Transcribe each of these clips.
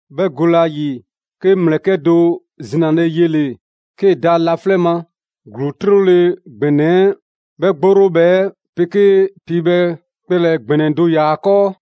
'Bhɛ gole ‑a ‑yi, 'ke 'ŋ ‑mlɛkɛ' do zinale yele‑ 'kee‑ da laflɛ' ma. ‑Gluu 'trole‑ ‑gbɛnɛ 'ɛ 'bhɛ 'gborobhɛ 'ɛ 'pegee piibhɛ kpɛlɛ‑ ‑gbɛnɛ do ‑yaa ‑a 'kɔɔ.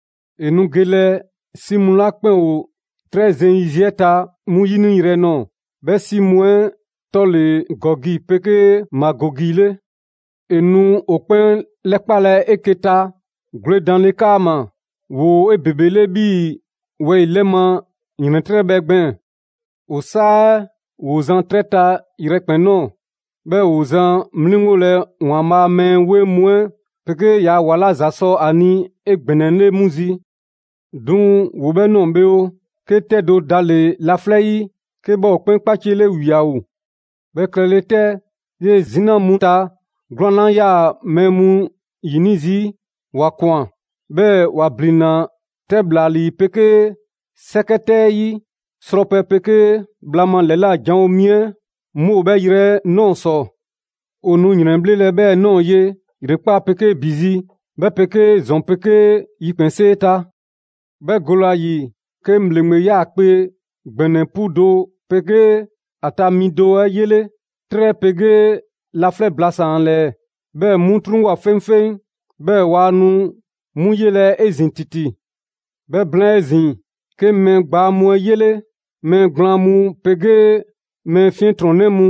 ‑E nu gelɛ 'si mu 'la 'kpɛn ‑o 'trɛ zeŋ yiziɛ 'ɛ ta 'mu 'yiniyrɛ nɔɔ‑. 'Bhɛ 'si mu 'ɛ 'tɔ ‑le Gɔgi 'pegee Magɔgi 'le. ‑E nu ‑o 'kpɛn 'lɛkpalɛ 'eke‑ ta gwledanle 'kaama‑. ‑Woo 'ebebele 'bhii‑ wɛyi‑ 'lɛ ma ‑yrɛntrɛbhɛ gbɛɛn‑. ‑O 'saa 'ɛ ‑woo zan 'trɛ ta yrɛkpɛn‑ ꞊nɔɔ, 'bhɛɛ‑ ‑woo zan 'mliŋgolɛ ‑Waanbhaa' a mɛɛ 'weŋ mu 'ɛ 'pegee ‑yaa' ‑wa 'la ‑za sɔ ‑a ni 'egbɛnɛle 'mu zi. 'Duŋ‑ ‑woo 'bhɛɛ‑ ꞊nɔɔ bhe oo, 'ke 'tɛ do dale‑ laflɛ' 'yi, 'ke 'bhɛ ‑o 'kpɛn 'kpaciele ‑wiao! 'Bhɛ klɛle 'tɛ, 'yee‑ 'zina mu ta gwlɛn 'la 'yaa‑ mɛɛ mu 'yini zii', ‑wa ꞊kwan, 'bhɛɛ‑ ‑wa ‑blinna 'tɛ ‑bhlalii 'pegee 'sɛkɛ 'tɛ 'ɛ 'yi. Srɔpɛ 'pegee bhla ma ‑lɛla' janwo mi 'ɛ 'mu ‑o 'bhɛɛ‑ yrɛ 'ɛ ꞊nɔɔ ‑sɔ. ‑O nu ‑yrɛnbhlelɛ 'bhɛɛ‑ ꞊nɔɔ ye ‑yrekpaa' 'pegee ‑bi zi, 'bhɛ 'pegee ‑zɔn 'pegee yikpɛnsee ta. 'Bhɛ gole ‑a ‑yi, 'ke 'ŋ ‑bhleŋgbe 'yaakpe‑ ‑gbɛnɛ 'pu do 'pegee 'bhɛ ta mi 'ɛ 'yele. 'Trɛ 'pegee laflɛ' blasaan‑ ‑a ‑lɛɛ, 'bhɛɛ‑ 'mu 'truŋwoa꞊ 'feŋfeŋ, 'bhɛɛ‑ waa nu 'mu yelɛ 'ezin‑ ‑titi. 'Bhɛ blaan 'ezin‑, 'ke 'ŋ mɛɛ gbaa mu 'ɛ 'yele: mɛɛ gblaan mu 'pegee mɛɛ 'fiɛntrɔnnɛ mu;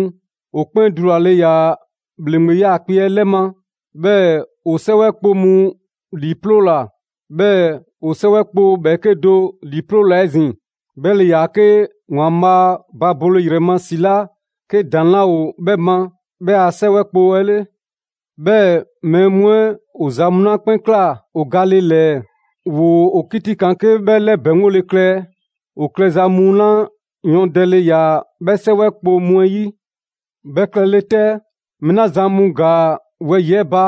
‑o 'kpɛn dulale ‑yaa ‑bhleŋgbe 'yaakpe‑ 'ɛ 'lɛ ma. 'Bhɛɛ‑ ‑o 'sɛwɛ kpo mu ‑liiploola. 'Bhɛɛ‑ ‑o 'sɛwɛ kpo ‑bhɛɛke' do ‑liiploola 'ezin‑: 'bhɛ ‑le ‑yaa 'ke ‑Waanbhaa' ba bole ‑yrɛ ma ‑si 'la 'ke ‑daŋ' 'laa ‑o 'bhɛ ma, 'bhɛ a 'sɛwɛ kpo 'ɛ 'le. 'Bhɛɛ‑ mɛɛ mu 'ɛ ‑o ‑za mu 'la 'kpɛn ꞊kla ‑o gale ‑lɛɛ, ‑woo ‑o 'kitikaan 'ke 'bhɛ 'lɛbɛŋgole klɛ ‑o klɛza mu 'ɛ 'le, ‑o klɛza mu 'la yɔɔndɛle ‑yaa 'bhɛ 'sɛwɛ kpo mu 'ɛ 'yi. 'Bhɛ klɛle 'tɛ, mɛɛ 'la zan mu ‑gaa wɛyi‑ 'ɛ ba,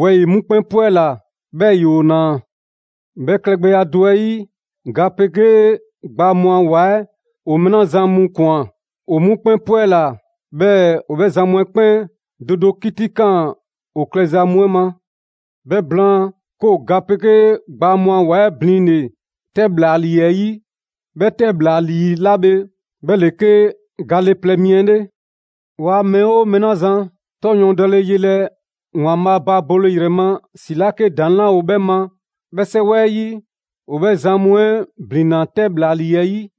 wɛyi‑ 'mu 'kpɛn 'pwɛla‑, 'bhɛɛ‑ ‑yoo ‑naa. 'Bhɛ klɛgbɛya do 'ɛ 'yi, ga 'pegee gbaa mu a ‑wa 'ɛ ‑o mɛɛ 'la zan mu ꞊kwan, ‑o 'mu 'kpɛn 'pwɛla‑. 'Bhɛɛ‑ ‑o 'bhɛ zan mu 'ɛ 'kpɛn do do 'kitikaan ‑o klɛza mu 'ɛ ma. 'Bhɛ blaan, 'ke ‑o ga 'pegee gbaa mu a ‑wa 'ɛ blinle‑ 'tɛ ‑bhlalii 'ɛ 'yi. 'Bhɛ 'tɛ ‑bhlalii 'la bhe 'bhɛ ‑le 'ke gale plɛ mi 'ɛ 'le. Waa mɛɛ 'oo mɛɛ 'la zan 'tɔ ‑yɔɔndɛle 'yelɛ‑ ‑Waanbhaa' ba bole ‑yrɛ ma ‑si 'la 'ke ‑daŋ' 'laa ‑o 'bhɛ ma 'bhɛ a 'sɛwɛ 'ɛ 'yi, ‑o 'bhɛ zan 'ɛ ‑blinna 'tɛ ‑bhlalii 'ɛ 'yi.